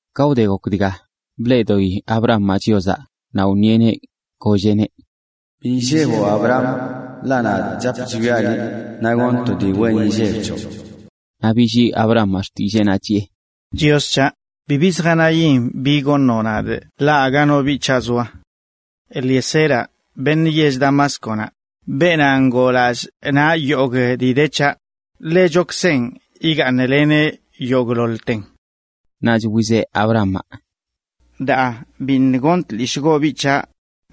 Ka wde gok dga, bleꞌdoꞌi Abramaꞌ Chiozaꞌ, naꞌ wṉieꞌneꞌ, golleꞌneꞌ: ―Bi illeboꞌ Abram, ḻaꞌ nadꞌ chap chwiaꞌ liꞌ, naꞌ goṉꞌ to dii wen inlleb c̱hoꞌ. Naꞌ billii Abramaꞌ xtilleenaꞌ, chiꞌe: ―Chios c̱haꞌ, bibi zjanayin bi goṉoꞌ nadꞌ ḻaꞌ aga no biꞌ c̱haꞌ zoa. Eliezeraꞌ, beṉꞌ yell Damásconaꞌ, beenaꞌ ngoo lallꞌ naꞌ yogꞌ dii de c̱haꞌ, ḻechokzenꞌ igaaṉleneꞌ yogꞌḻoḻten. Naꞌch wizeꞌ Abramaꞌ: ―Daa biṉꞌ goṉ tlishꞌgoꞌ biꞌ c̱haꞌ,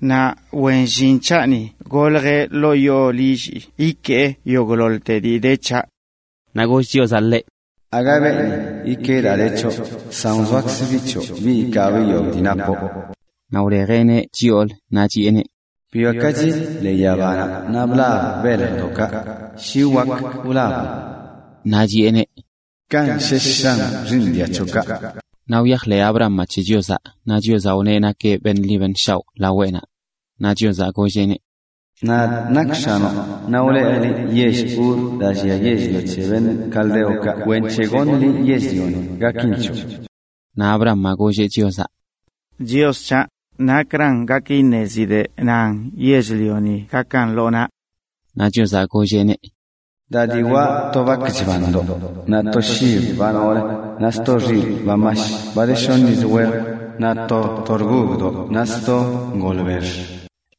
naꞌ wen llin c̱haꞌni goljə ḻoo yoo lillii ikee yogꞌḻoḻ dii de c̱haꞌ. Naꞌ goll Chiozaꞌ ḻeꞌ: ―Aga beeni ikee daa de c̱hoꞌ, san wzoakzə biꞌ c̱hoꞌ biꞌ ikaabꞌ yogꞌ dii napoꞌ. Naꞌ wlejeꞌneꞌ chyoolə naꞌ chiꞌeneꞌ: ―Bwiakachi ḻee yabanaꞌ naꞌ blab beljdoꞌkaꞌ, shi wak wlaboꞌn. Kanꞌ shesh shan xiiṉ dia c̱hoꞌkaꞌ. Naꞌ wyajḻeꞌ Abramaꞌ c̱he Chiozaꞌ naꞌ Chiozaꞌ wneꞌ nakeꞌ beṉꞌ ḻi beṉꞌ shaoꞌ laweꞌnaꞌ. Naꞌ Chiozaꞌ golleꞌneꞌ: ―Nadꞌ nakꞌ X̱anoꞌ, naꞌ wlejꞌ liꞌ yell Uraꞌ daa llia yell-lio c̱he caldeokaꞌ kwenc̱he goṉꞌ liꞌ yell-lioni gakin c̱hoꞌ. Naꞌ Abramaꞌ golleꞌ Chiozaꞌ: ―Chios c̱haꞌ, ¿nakra gak iṉezidꞌ nan yell-lioni gakan lo naꞌ? Naꞌ Chiozaꞌ golleꞌneꞌ: ―Da diwaꞌ to bak chbandoꞌ, naꞌ to shib ba noolə, naꞌ sto xilꞌ ba mash, ba de shoṉ yiz wej, naꞌ to torgogdoꞌ naꞌ sto ngolbex.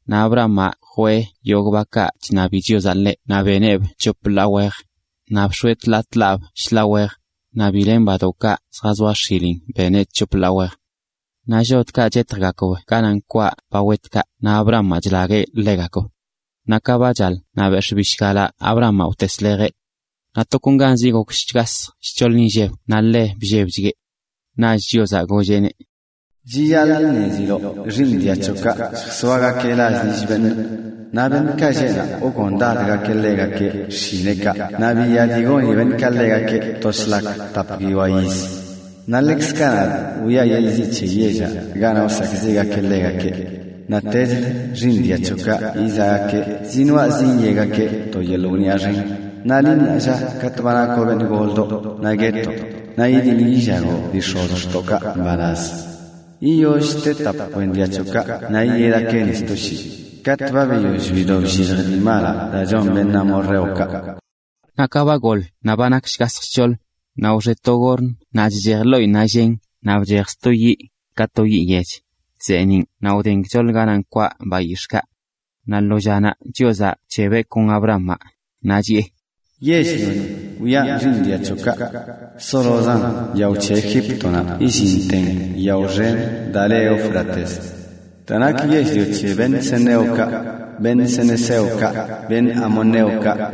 Naꞌ Abramaꞌ jwee yogꞌ bakaꞌ chṉabi Chiozaꞌ ḻeꞌ naꞌ beneꞌb c̱hop ḻaa wejə. Naꞌ bx̱oeꞌ tḻaa tḻaab shḻaa wej. Naꞌ bi len badoꞌkaꞌ zjazoa x̱ilin beneꞌ c̱hop ḻaa wejə. Naꞌ llodkaꞌ chetjgakb ganaꞌ nkwaꞌ ba wetkaꞌ naꞌ Abramaꞌ chlagueꞌ ḻegakb. Naꞌ ka ba chaḻ, naꞌ bex̱ꞌ bishgalaꞌ Abramaꞌ wteslejeꞌ. Naꞌ tokonganzi gok shgasj shc̱hoḻ inlleb naꞌ ḻe bllebchgueꞌ. Naꞌch Chiozaꞌ golleꞌneꞌ: ―Chiyaḻꞌ iṉeziloꞌ xiiṉ dia c̱hoꞌkaꞌ lljazoagakeꞌ() lall lill beṉꞌ, naꞌ beṉꞌkaꞌ lleꞌ naꞌ wgondadgakeꞌ ḻegakeꞌ xshineꞌkaꞌ naꞌ biya dii goni beṉꞌkaꞌ ḻegakeꞌ to shlak tap guiyoa yiz. Naꞌ ḻekzkaꞌ nadꞌ wiꞌa yeḻꞌ ziꞌ c̱he yellaꞌ ganaꞌ wsakꞌziꞌgakeꞌ ḻegakeꞌ. Naꞌtechlə xiiṉ dia c̱hoꞌkaꞌ yizaꞌgakeꞌ zinoaꞌ zinyegakeꞌ to yeḻꞌ wniꞌa xen. Naꞌ liꞌ, naa lla, katꞌ ba nakoꞌ beṉꞌ goldoꞌ, naꞌ guetoꞌ naꞌ yidiḻ yillagoꞌ dii x̱ozxtookaꞌ mbalaz. Yiyoll te tap kwen dia c̱hoꞌkaꞌ naꞌ yiyedgakeꞌ ni sto shii, katꞌ ba biyoll bido bllilj dii malaꞌ daa chon beṉꞌ amorreokaꞌ. Naꞌ ka ba goḻ naꞌ ba nak shgasj shc̱hoḻ, naꞌ wxe to gorn naꞌ chchej ḻoꞌinnaꞌ llen naꞌ bchej sto yiꞌ, ka to yiꞌ yech, chzeeniꞌn naꞌ wden gchoḻ ganaꞌ nkwaꞌ bayix̱ꞌkaꞌ. Naꞌ lo llanaꞌ Chiozaꞌ bc̱hebeꞌ kon Abramaꞌ, naꞌ chiꞌe: ―Yell-lioni wiꞌan xiiṉ dia c̱hoꞌkaꞌ, zolozan yao c̱he Egíptonaꞌ yillinten yao xen daa le Éufrates: daa nak yell-lio c̱he ceneokaꞌ, cenezeokaꞌ, cadmoneokaꞌ,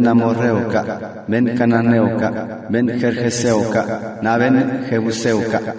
amorreokaꞌ, cananeokaꞌ, gergeseokaꞌ naꞌ jebuseokaꞌ.